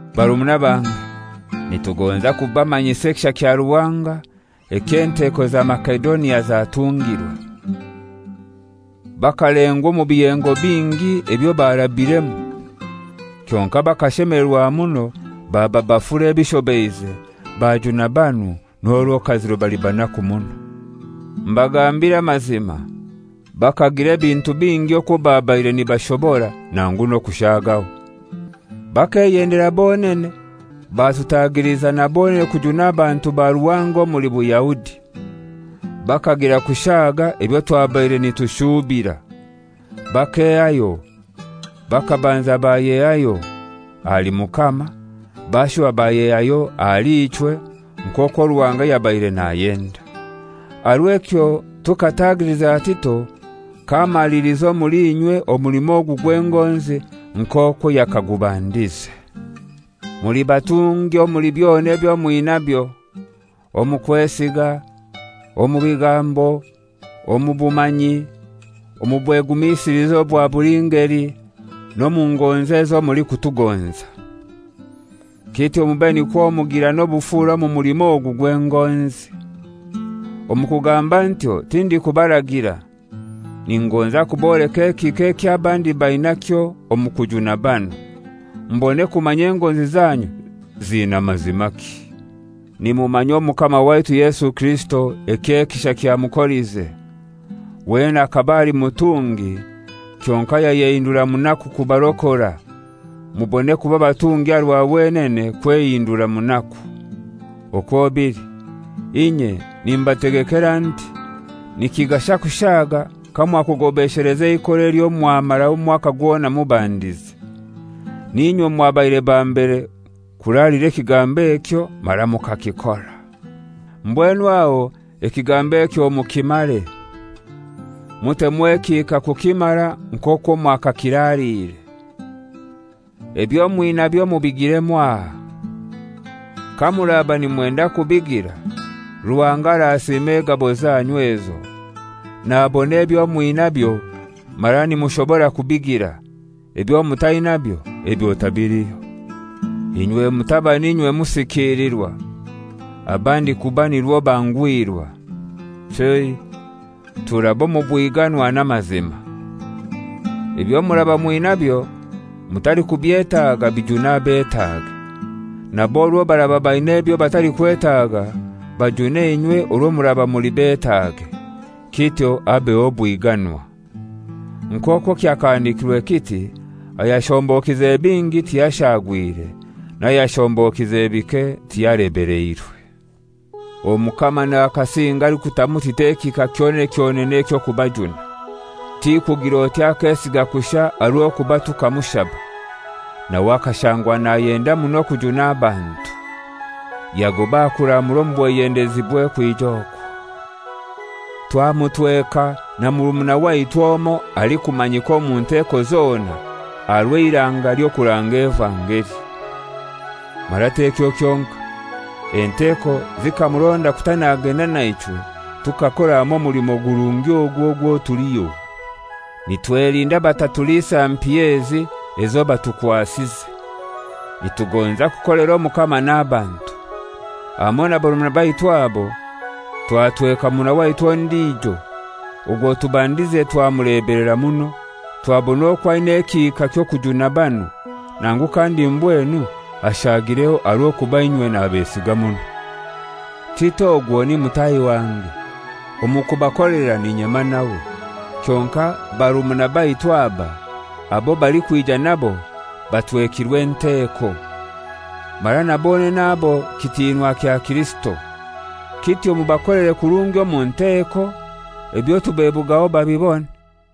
Barumuna bange, nitugonza kubamanyisa ekisha kya Ruhanga ekyo enteko za Masedonia zatungirwe. Bakalengwa omu biyengo bingi ebyo barabiremu; kyonkai bakashemelerwa muno, baba bafura ebishobeize, bajuna banu, n'orwo kaziro bali banaku muno. Mbagambire amazima, bakagira ebintu bingi okwo babaire nibashobora, nangu n'okushagaho. Bakeyendera bonene batutagiliza na bonene kujuna abantu ba Ruhanga omuli Buyahudi. Bakagira kushaaga ebyo twabaire nitushuubira: Bakehayo, bakabanza bayehayo: Ahali Mukama, bashuba bayehayo ahali ichwe nk'okwo Ruhanga yabaire nayenda. Aha rw'ekyo tukatagiliza Tito k'amaliliza omuli inywe omulimo ogu gw'engonzi nk'okwo yakagubandize. Muli batungi omuli byona ebyo mwinabyo: Omu kwesiga, omu bigambo, omu bumanyi, omu bwegumisiliza obwa buli ngeli, n'omu ngonzi ezo mulikutugonza. Kityo mube nikwo mugira n'obufura omu mulimo ogu gw'engonzi. Omu kugamba ntyo tindikubaragira. Ningonza kuboleka ekihika eky'abandi bainakyo omu kujuna banu, mbone kumanya engonzi zanyu zina mazimaki. Nimumanya Omukama waitu Yesu Kirisito eky'ekisha kyamukolize: Wenene akaba ali mutungi, kyonkai yayehindura munaku kubarokora, mubone kuba batungi aha rwa wenene kwehindura munaku. Okwo bili, inye nimbategekera nti: Nikigasha kushaaga kamwakugobesheleza eikora elyo mwamara omwaka gwona mubandize. Ninywe mwabaire ba mbere kuralira ekigambo ekyo mara mukakikora. Mbwenu aho ekigambo ekyo mukimare. Mutemu ekihika kukimara nk'okwo mwakakiraliire: Ebyo mwinabyo mubigire mwaha. Kamuraba nimwenda kubigira, Ruhanga arasiima egabo zanyu ezo, nabona ebyo mwinabyo mara nimushobora kubigira, ebyo mutainabyo ebyo tabiliho. Inywe mutaba n'inywe musikilirwa, abandi kuba nirwo banguhirwa; chei, turabe omu bwiganwa n'amazima. Ebyo muraba mwinabyo mutalikubyetaga bijune abetaage, nabo orwo baraba baina ebyo batalikwetaga, bajune inywe orwo muraba muli betaage, kityo habeho obwiganwa. Nk'okwo kyahandikirwe kiti, «Ayashombokize bingi tiyashagwire, n'ayashombokize bike tiyalebeleirwe.» Omukama nakasinge alikutamu Tito ekihika kyonene kyonene eky'okubajuna. Ti kugir'oti akesiga kushai aha rw'okuba tukamushaba, nawe akashangwa nayenda muno kujuna abantu, yagoba aha kuramura omu bweyendezibwe kwija okwo. Twamutweka na murumuna waitu omoi alikumanyika omu nteeko zona aha rw'eiranga ly'okuranga evangeli. Mara t'ekyo kyonkai: Enteko zikamuronda kuta nagenda na ichwe tukakora hamoi omulimo gurungi ogu ogwo tuliho. Nitwelinda batatulisa mpiya ezi ezo batukwasize. Nitugonza kukolera Omukama n'abantu. Hamoi na barumuna baitu abo, twatweka murumuna waitu ondijo; ogwo tubandize twamulebelera muno, twabona okwo aina ekihika ky'okujuna banu, nangu kandi mbwenu ashaagireho aha rw'okuba inywe nabesiga muno. Tito ogwo ni mutahi wange; omu kubakolera n'inyema nawe. Kyonkai barumuna baitu aba, abo balikwija nabo, batwekirwe enteko, mara bonene abo kitinwa kya Kirisito. Kityo mubakolere kurungi omu nteeko, ebyo tubebugaho babibone.